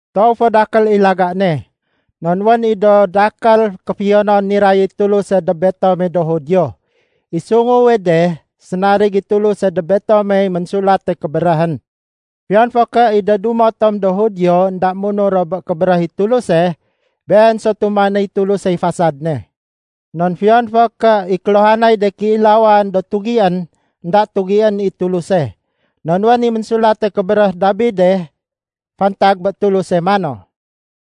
Toow fo dakél i laga ne. Non wén i do dakél kéfiyonon niray i Tuluse dob betome do Judio. I sunguwe de, sénarig i Tuluse dob betomey Ménsulate Kébéréhén. Fiyon fo ké i de dumo tom do Judio énda munur ro bé Kébéréh i Tuluse, been so tumanéy Tulusey fasad ne. Non fiyon fo ké i kéluhanay de kéilawan do tugién, énda tugién i Tuluse. Non wén i ménsulate kébéréh Dabide fantag bé Tuluse mano,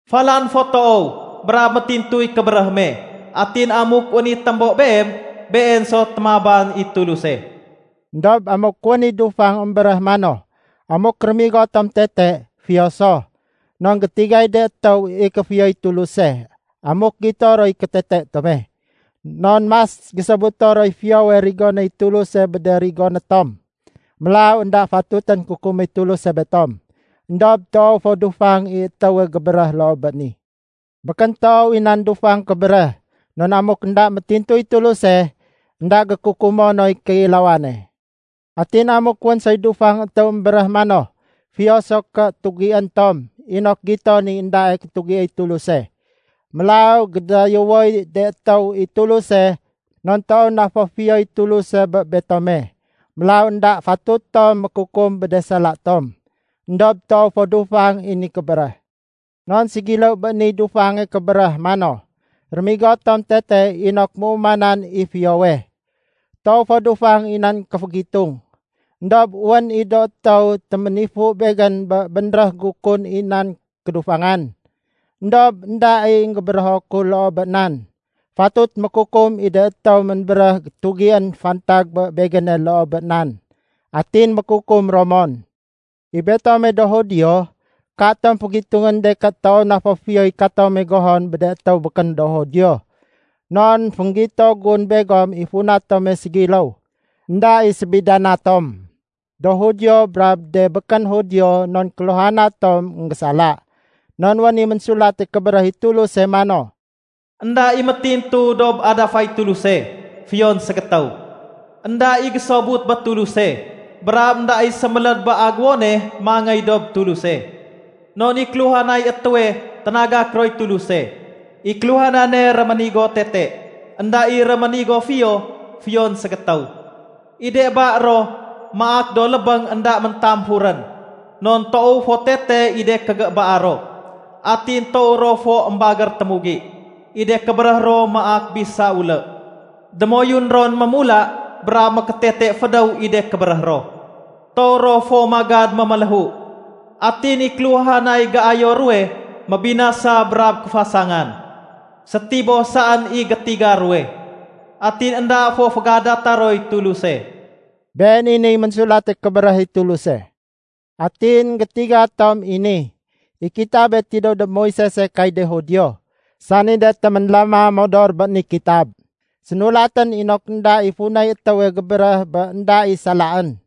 “Falan fo toow brab métintuy kébéréh me. Atin amuk wén i témbo Beem, Been so témaban i Tuluse.” Endob amuk wén i dufang émbéréh mano, “Amuk rémigo tom tete, fiyo so, non gétigay de étéw i kéfiyoy Tuluse amuk gito roy kétete tome. Non mas gésobuto roy fiyowe rigonéy Tuluse bé de rigoné tom. Mélaw énda fatutén kukuméy Tuluse betom.” Endob toow fo dufang i étéwe gébéréh loo bé ni. Békén toow i nan dufang kébéréh, non amuk énda métintuy Tuluse, énda gékukumo noy kéilawane. Atin amuk wén soy dufang étéw émbéréh mano, “Fiyo so ké tugién tom inok giton i éndae kétugiéy Tuluse. Mélaw gédayéwoy de étéw i Tuluse non toow na fo fiyoy Tuluse bé betome. Mélaw énda fatut tom mékukum bé de sala tom.” Endob toow fo dufang i ni kébéréh. Non ségiléw bé niy dufange kébéréh mano, “Rémigo tom tete inok méumanan i fiyowe.” Toow fo dufang i nan kéfégitung. Endob wén i do étéw téménifu begén bé bénréh gu kun i nan kédufangan. Endob énda i énggébérého ku loo bé nan. Fatut mékukum i de étéw ménbéréh tugién fantag bé begéne loo bé nan. Atin mékukum ro mon. I betome do Judio, katom fégitungén de ké toow na fo fiyoy katome gohon bé de étéw békén do Judio. Non fénggito gun begom i funa tome ségiléw. Enda i sébidana tom do Judio brab de békén Judio non kéluhana tom énggésala. Non wén i Ménsulate Kébéréh i Tuluse mano, “Enda i métintu dob adafay Tuluse, fiyon ségétéw. Enda i gésobut bé Tuluse, brab énda i séméléd bé agéwone mangéy dob Tuluse. Non i kéluhanay étéwe ténagak roy Tuluse. I kéluhanane réménigo tete. Enda i réménigo fiyo, fiyon ségétéw. I de ba ro maak do lébéng énda méntamfurén. Non toow fo tete i de kégébaa ro. Atin toow ro fo émbagér témugi. I de kébéréh ro maak bisa ulé. Démoyun ron mémula brab mékétete fédéw i de kébéréh ro. Toow ro fo magad méméléhu. Atin i kéluhanay géayo ruwe mébinasa brab kéfasangan. Sétiboh saén i gétiga ruwe. Atin énda fo fégadata roy Tuluse.” Been i niy Ménsulate Kébéréh i Tuluse. Atin énggétiga tom i ni: I kitabe tidéw dob Moisese kay de Judio, sani de téménlama modor bé ni kitab. Sénulatén inok énda i funay étéwe gébéréh bé énda i salaén.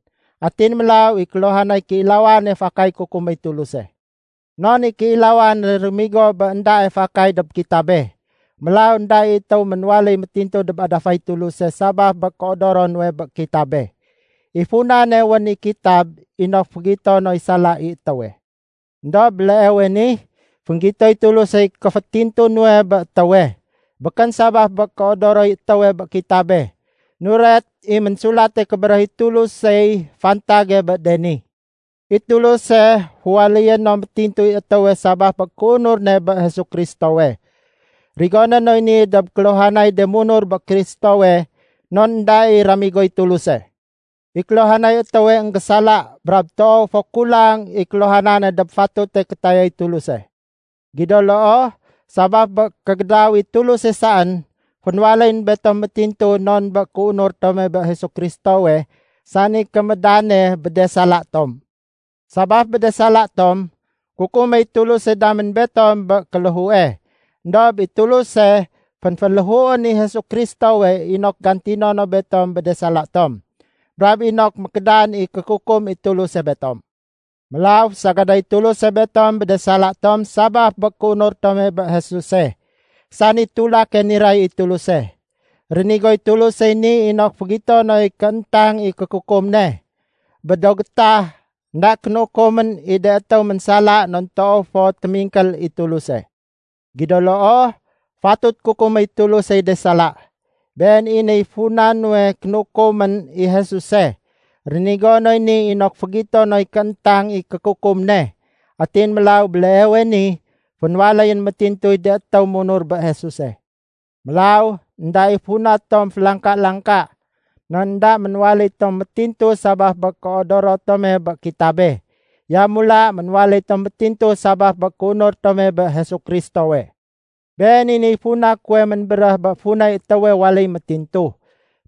Atin mélaw i kéluhanay kéilawane fakay kukuméy Tuluse. Non i kéilawane réménigo bé éndae fakay dob kitabe. Mélaw énda i étéw ménwaléy métintu dob adafay Tuluse sabaf bé kéodoro nuwe bé kitabe. I funane wén i kitab inok fégito noy sala i étéwe. Endob béleewe ni, fénggitoy Tulusey kéfétintu nuwe bé étéwe. Békén sabaf bé kéodoroy étéwe bé kitabe. Nuret i Ménsulate Kébéréh i Tulusey fantage bé de ni. I Tuluse, féwaléyé no métintuy étéwe sabaf bé kéunur ne bé Jesu Kristowe. Rigoné noy ni dob kéluhanay de munur bé Kristowe non énda i ramigoy Tuluse. I kéluhanay étéwe énggésala brab toow fo kulang i kéluhanane dob fatute kétayay Tuluse. Gido loo, sabaf bé kégédaw i Tuluse saén, fénwaléyén betom métintu non bé kéunur tome bé Jesu Kristowe sani kémédane bé de sala tom. Sabaf bé de sala tom, kukuméy Tuluse damén betom bé kéléhue. Endob i Tuluse fénféléhuén i Jesu Kristowe inok gantino no betom bé de sala tom, brab inok mékédan i kékukum i Tuluse betom. Mélaw fésagadéy Tuluse betom bé de sala tom sabaf bé kéunur tome bé Jesuse, sani tulake niray i Tuluse. Rénigoy Tulusey ni inok fégito noy kééntang i kékukum ne. Bé do gétah, énda kénukumén i de étéw ménsala non toow fo témingkél i Tuluse. Gido loo, fatut kukuméy Tulusey de sala. Been i niy funa nuwe kénukumén i Jesuse. Rénigo noy ni inok fégito noy kééntang i kékukum ne. Atin mélaw béleewe ni, fénwaléyén métintuy de étéw munur bé Jesuse. Mélaw énda i funa tom félangka-langka. Non énda ménwaléy tom métintu sabaf bé kéodoro tome bé kitabe. Yamula ménwaléy tom métintu sabaf bé kéunur tome bé Jesu Kristowe. Been i niy funa kuwe ménbéréh bé funay étéwe waléy métintu,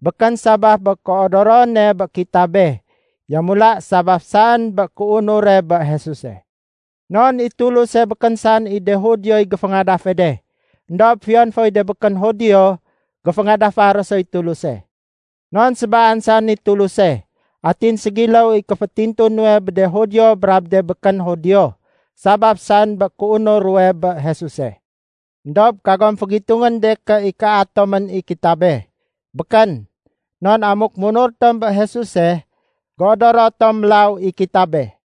békén sabaf bé kéodorone bé kitabe, yamula sabaf saén bé kéunure bé Jesuse. Non i Tuluse békén saén i de Judioy géféngadafe de, éndob fiyon foy de békén Judio géféngadafa ro soy Tuluse. Non sébaan saén i Tuluse. Atin ségiléw i kéfétintu nuwe bé de Judio brab de békén Judio, sabaf saén bé kéunur ruwe bé Jesuse. Endob kagom fégitungén de ké ikaa tomén i kitabe. Békén! Non amuk munur tom bé Jesuse, géodoro tom mélaw i kitabe.